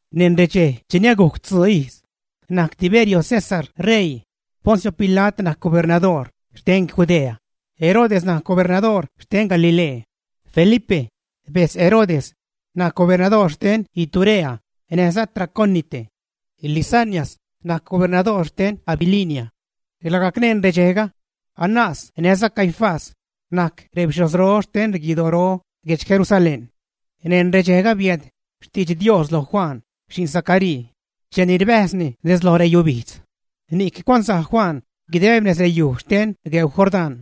Neṉ redxej cheni agujc tzuun ijz najc Tiberio César ṟeii, Poncio Pila't najc gobernadoor xten Judea; Herodes najc gobernadoor xten Galilee; Felipe, bejtz Herodes najc gobernadoor xten Iturea näjza Traconite; Lisanias najc gobernadoor xten Abilinia. Lagajc neṉ redxejga Anás näjza Caifás najc rebixhojzro xten guidoro guedx Jerusalén. Neṉ redxejga biääd xtidx Dios lo Juan, xi'n Zacaríi cheni rbäjzni nez lo reyubijdz. Ni'c cuanzaj Juan guideb nez reyuj xten gueu Jordán,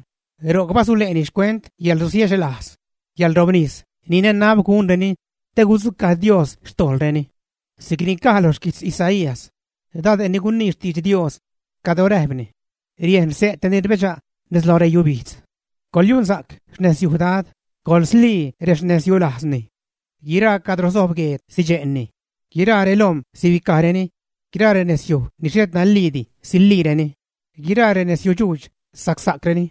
ro'c basule'ni xcuent yäḻrusiechlajz, yäḻrobnis ni nanab gunreni te gudzucaj Dios xtojḻreni. Si'cni caj lo xquijtz Isaías, dade' ni gunii xtidx Dios, cadro räjpni: Riejn xse' te ni rbedxa' nez loj reyubijdz: “Coḻyunsa'c xnezyuj Dad, coḻslii rexnezyulajzni.” Guiraa cadro sojb gueed sidxe'ni, guiraa relom̲ sibicajreni, guiraa renezyuj ni xhet naliidi, siliireni, guiraa renezyudxuudx, sacsa'creni.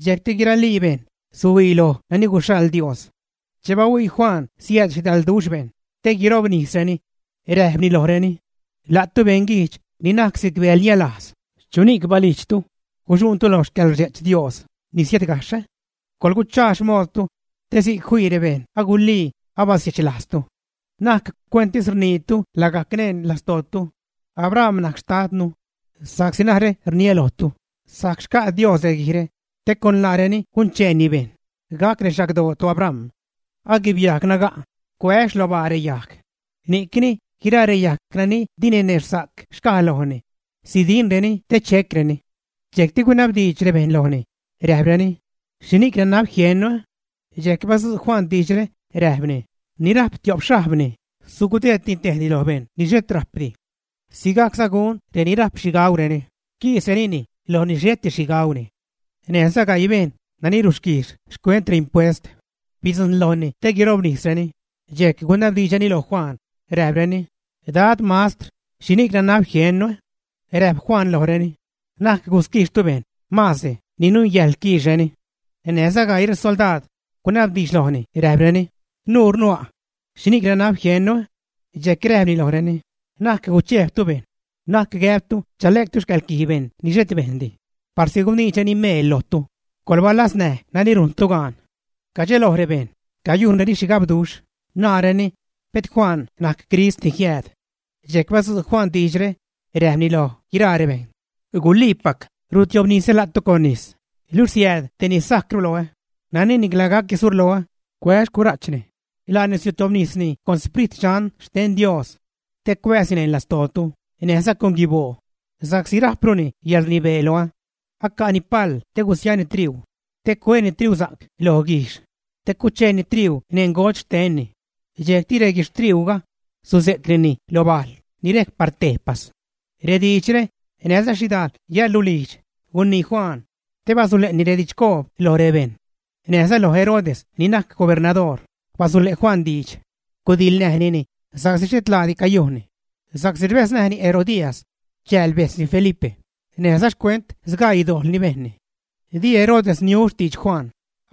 Dxejcti guiralii bejṉ suhuii loj nani guxhaḻ Dios. Che bahuii Juan siääd xhidalduxh bejṉ te guirobnisreni, räjpni lojreni: ―¡La'tu beṉguijdx ni najc si'c bäḻnialajz! ¿Chuni'c balijdxtu guxuṉtu loj xcäḻrdxe'ch Dios ni siädgajxh, ä? Coḻguchaa xmoodtu te si'c fii bejṉ guliini abasiechlajztu. Na'c cuentis rniitu lagajc neṉ lastootu “Abram najc xtadnu”, sa'csi narä rniä lojtu, sajc xca' Dios reguijre te con laareni guncheeni bejṉ gac rexagdoo toAbram. Aguibyajg naga' cuä' xlobaa reyajg; ni'cni guiraa reyajg nani di ninexhsa'c xcaj lojni, sidinreni te checreni. Dxejcti gunabdiidx rebejṉ lojni, räjpreni: ―¿Xhini'c nanab jiennu? Dxejc badzu' Juan diidxre räjpni: ―Ni rajp tio'p xhajbni, sugudeedni tejni lo bejṉ ni xhet rajpdi. Sigajcza gun reni rajp xhi gaureni, quisrenini loj ni xheti xhi gauni. Näjza gaii bejṉ nani rusquijx xcuent reimpuest bidzujṉ lojni te guirobnisreni, dxejc gunabdiidxreni lo Juan räjpreni: ―Dad, mastr, ¿xhini'c nanab jiennu? Räjp Juan lojreni: ―Na'c gusquijxtu bejṉ maazdi ni nungäjḻ quiixreni. Näjza gaii resoldaad gunabdiidx lojni räjpreni: ―¿Nurnu a'? ¿Xhini'c nanab jiennu? Dxejc räjpni lojreni: ―Na'c guchejbtu bejṉ; na'c gäbtu chale'ctu xcäḻquij bejṉ ni xhet bejndi parsi guniidxreni meel lojtu; coḻbalaznäj nani rujntu gaan. Cadxeloj rebejṉ, cayujnreni xhigabduxh, naareni, “pet Juan najc Crist ni jiääd.” Dxejc badzu' Juan diidxre, räjpni loj guiraa rebejṉ: ―Guliipac rutiobnisä la'tu con nis, luxh siääd tej ni sajcru loä, nani nicla gac surloä, cuää xcura'chni. Laani sutiobnisni con Sprit Dxan xten Dios te cuääzni neṉ lastootu näjza con guiboo, sa'csi rajpruni yäḻrnibee loä. Aca'ni pal te gusiani triuu te cuääni triusa'c lo guijxh te cucheeni triuu neṉ ngodx xtenni, dxejcti reguixhtriuuga suze'cnini lo bajl ni rejc par tejpas. Rediidxre näjza xhidajl yäḻrulijdx gunii Juan te basule'ni redidxcoob loj rebejṉ. Näjza lo Herodes ni najc gobernadoor basule' Juan diidx, gudiḻnäjnini sa'csi xhet laadi cayujnni, sa'csi rbäznäjni Herodías, chääl bejtzni Felipe, näjza xcuent sgaii dojḻ ni bejnni. Di Herodes niu xtidx Juan,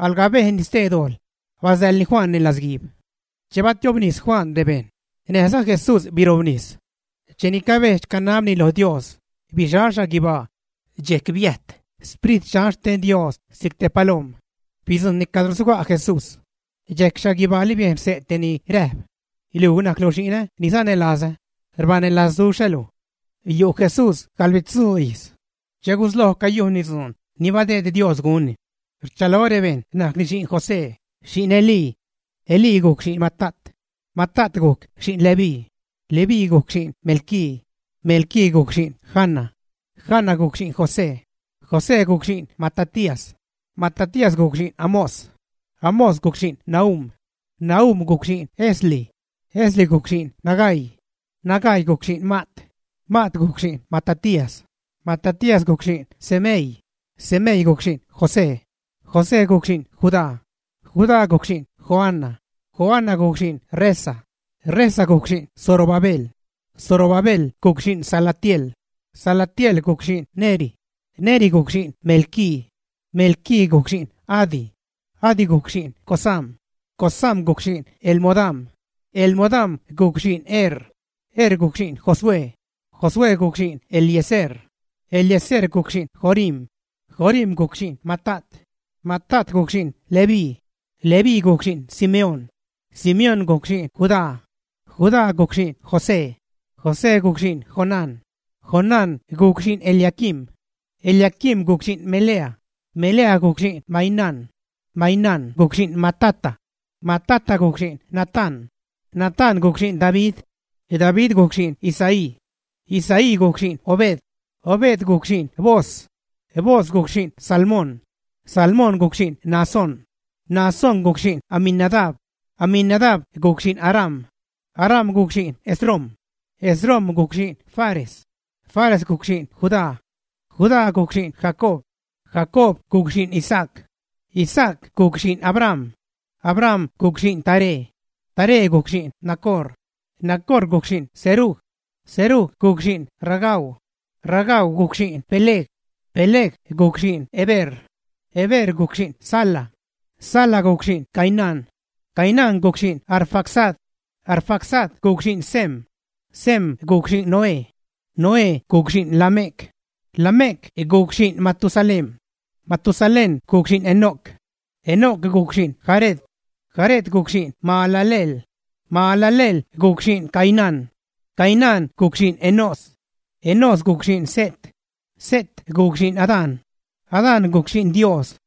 alga bejnni stee dojḻ, basäḻni Juan neṉ latzguiib. Che batiobnis Juan rebejṉ, näjza Jesús birobnis. Cheni cabedx-canabni lo Dios, bixal xhaguibaa, dxejc biäjt Sprit Dxan xten Dios si'c te palom̲, bidzujṉni cadro suga' Jesús. Dxejc xhaguibaali biejn xse' te ni räjp: ―Luj, najclu xi'nä ni sanälazä. Rbanälazduxhä luj. Yu' Jesús gaḻbitzuu ijz che gusloj cayujnni dzuun ni badeed Dios gunni. Rchalo rebejṉ najcni xi'n José, xi'n Elí. Elí gujc xi'n Matat. Matat gujc xi'n Leví. Leví gujc xi'n Melqui. Melqui gujc xi'n Jana. Jana gujc xi'n José. José gujc xi'n Matatías. Matatías gujc xi'n Amós. Amós gujc xi'n Nahum. Nahum gujc xi'n Esli. Esli gujc xi'n Nagai. Nagai gujc xi'n Maat. Maat gujc xi'n Matatías. Matatías gujc xi'n Semei. Semei gujc xi'n José. José gujc xi'n Judá. Judá gujc xi'n Joana. Joana gujc xi'n Resa. Resa gujc xi'n Zorobabel. Zorobabel gujc xi'n Salatiel. Salatiel gujc xi'n Neri. Neri gujc xi'n Melqui. Melqui gujc xi'n Adi. Adi gujc xi'n Cosam. Cosam gujc xi'n Elmodam. Elmodam gujc xi'n Er. Er gujc xi'n Josué. Josué gujc xi'n Eliezer. Eliezer gujc xi'n Jorim. Jorim gujc xi'n Matat. Matat gujc xi'n Leví. Leví gujc xi'n Simeón. Simeón gujc xi'n Judá. Judá gujc xi'n José. José gujc xi'n Jonán. Jonán gujc xi'n Eliaquim. Eliaquim gujc xi'n Melea. Melea gujc xi'n Mainán. Mainán gujc xi'n Matata. Matata gujc xi'n Natán. Natán gujc xi'n David. David gujc xi'n Isaí. Isaí gujc xi'n Obed. Obed gujc xi'n Booz. Booz gujc xi'n Salmón. Salmón gujc xi'n Naasón. Naasón gujc xi'n Aminadab. Aminadab gujc xi'n Aram. Aram gujc xi'n Esrom. Esrom gujc xi'n Fares. Fares gujc xi'n Judá. Judá gujc xi'n Jacob. Jacob gujc xi'n Isaac. Isaac gujc xi'n Abraham. Abraham gujc xi'n Taré. Taré gujc xi'n Nacor. Nacor gujc xi'n Serug. Serug gujc xi'n Ragau. Ragau gujc xi'n Peleg. Peleg gujc xi'n Heber. Heber gujc xi'n Sala. Sala gujc xi'n Cainán. Cainán gujc xi'n Arfaxad. Arfaxad gujc xi'n Sem. Sem gujc xi'n Noé. Noé gujc xi'n Lamec. Lamec gujc xi'n Matusalén. Matusalén gujc xi'n Enoc. Enoc gujc xi'n Jared. Jared gujc xi'n Mahalaleel. Mahalaleel gujc xi'n Cainán. Cainán gujc xi'n Enós. Enós gujc xi'n Set. Set gujc xi'n Adán. Adán gujc xi'n Dios.